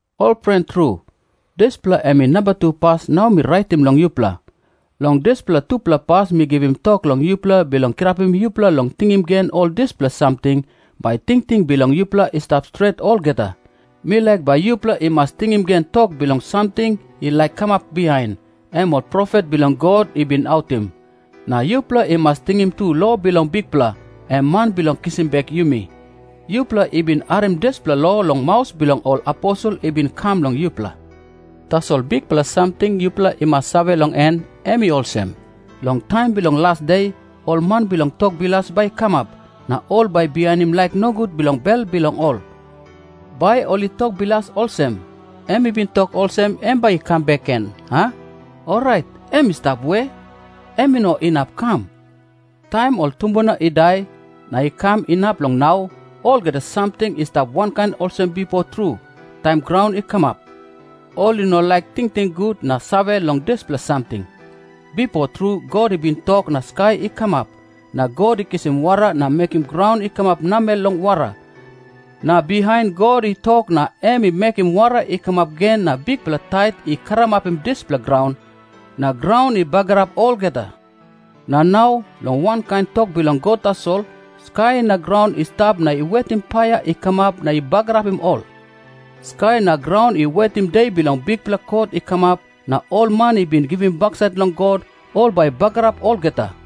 Ol pren tru, dispela em i namba pas nau mi raitim long yupela. Long dispela tupela pas mi givim tok long yupela bilong kirapim yupela long tingim gen ol dispela samting, bai tingting bilong yupela i stap stret olgeta. 2Mi laik bai yupela i mas tingim gen tok bilong samting i laik kamap bihain, em ol profet bilong God i bin autim. Na yupela i mas tingim tu lo bilong Bikpela, em Man bilong kisim bek yumi. Yupela i bin harim dispela lo long maus bilong ol aposel i bin kam long yupela. Tasol bikpela samting yupela i mas save long en, em i olsem. Long taim bilong las de, ol man bilong tok bilas bai i kamap, na ol bai i bihainim laik nogut bilong bel bilong ol. Bai ol i tok bilas olsem, “Em i bin tok olsem em bai i kam bek gen, a? Orait em i stap we? Em i no inap i kam. Taim ol tumbuna i dai, na i kam inap long nau, olgeta samting i stap wankain olsem bipo tru, taim graun i kamap.” Ol i no laik tingting gut na save long dispela samting. Bipo tru God i bin tok na skai i kamap. Na God i kisim wara na mekim graun i kamap namel long wara. Na bihain God i tok na em i mekim wara i kamap gen na bikpela tait i karamapim dispela graun, na graun i bagarap olgeta. Na nau, long wankain tok bilong God tasol, skai na graun i stap na i wetim paia i kamap na i bagarapim ol. Skai na graun i wetim de bilong bikpela kot i kamap, na ol man i bin givim baksait long God, ol bai i bagarap olgeta.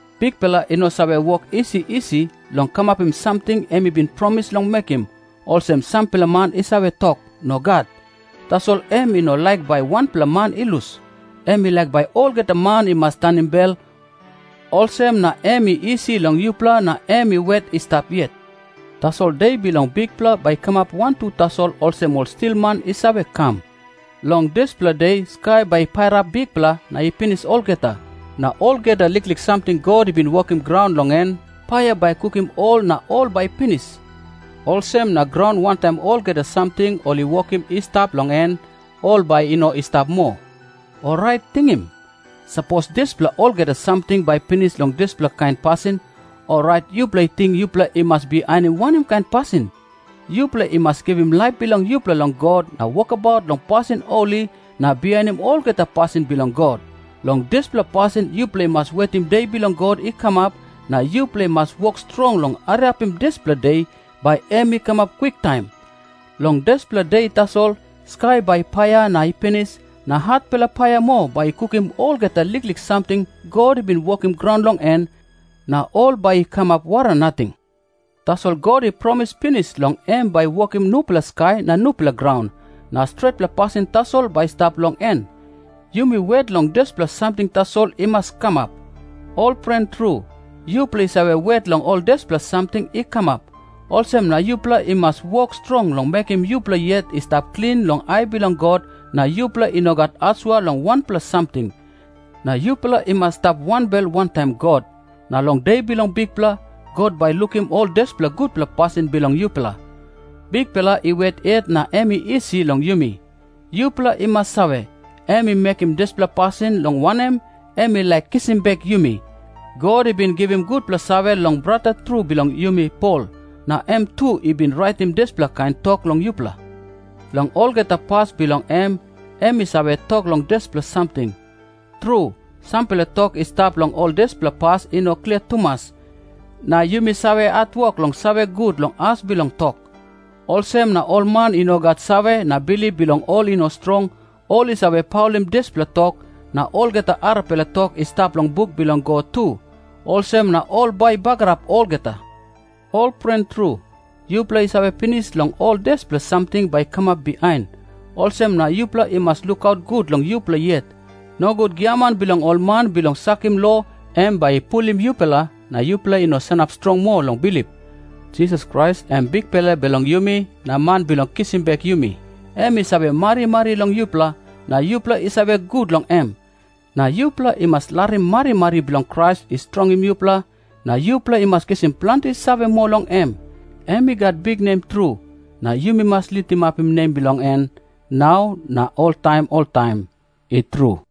Bikpela i no save wok isi isi long kamapim samting em i bin promis long mekim, olsem sampela man i save tok. Nogat. Tasol em i no laik bai wanpela man i lus. Em i laik bai olgeta man i mas tanim bel, olsem na em i isi long yupela na em i wet i stap yet. Tasol De bilong Bikpela bai i kamap wantu tasol olsem ol stilman i save kam. Long dispela De skai bai i pairap bikpela na i pinis olgeta. Na olgeta liklik samting God i bin wokim graun long en, paia bai i kukim ol na ol bai i pinis. Olsem na graun wantaim olgeta samting ol i wokim i stap long en, ol bai i no i stap moa. Orait tingim. Sapos dispela olgeta samting bai i pinis long dispela kain pasin, orait yupela i ting yupela i mas bihainim wanem kain pasin? Yupela i mas givim laip bilong yupela long God na wokabaut long pasin holi na bihainim olgeta pasin bilong God. Long dispela pasin yupela i mas wetim De bilong God i kamap, na yupela i mas wok strong long hariapim dispela De, bai em i kamap kwiktaim. Long dispela De tasol skai bai i paia na i pinis, na hatpela paia moa bai i kukim olgeta liklik samting God i bin wokim graun long en, na ol bai i kamap wara nating. Tasol God i promis pinis long em bai i wokim nupela skai na nupela graun, na stretpela pasin tasol bai i stap long en. Yumi wet long dispela samting tasol i mas kamap. Ol pren tru, yupela i save wet long ol dispela samting i kamap. Olsem na yupela i mas wok strong long mekim yupela yet i stap klin long ai bilong God na yupela i no gat asua long wanpela samting. Na yupela i mas i stap wanbel wantaim God. Na long De bilong Bikpela, God bai i lukim ol dispela gutpela pasin bilong yupela. Bikpela i wet yet na em i isi long yumi. Yupela i mas save, em i mekim dispela pasin, long wanem, em i laik kisim bek yumi. God i bin givim gutpela save long brata tru bilong yumi Pol, na em tu i bin raitim dispela kain tok long yupela. Long olgeta pas bilong em, em i save tok long dispela samting. Tru, sampela tok i stap long ol dispela pas i no klia tumas, na yumi save hatwok long save gut long as bilong tok. Olsem na ol man i no gat save na bilip bilong ol i no strong, ol i save paulim dispela tok, na olgeta arapela tok i stap long buk bilong God tu. Olsem na ol bai i bagarap olgeta. Ol pren tru, yupela i save pinis long ol dispela samting bai i kamap bihain. Olsem na yupela i mas lukaut gut long yupela yet. Nogut giaman bilong ol man bilong sakim lo em bai i pulim yupela na yupela i no sanap strong moa long bilip. Jisas Krais, em Bikpela bilong yumi na Man bilong kisim bek yumi, em i save marimari long yupela, na yupela i save gut long em. Na yupela i mas larim marimari bilong Krais i strongim yupela, na yupela i mas kisim planti save moa long em. Em i gat biknem tru, na yumi mas litimapim nem bilong en nau na oltaim oltaim. I tru.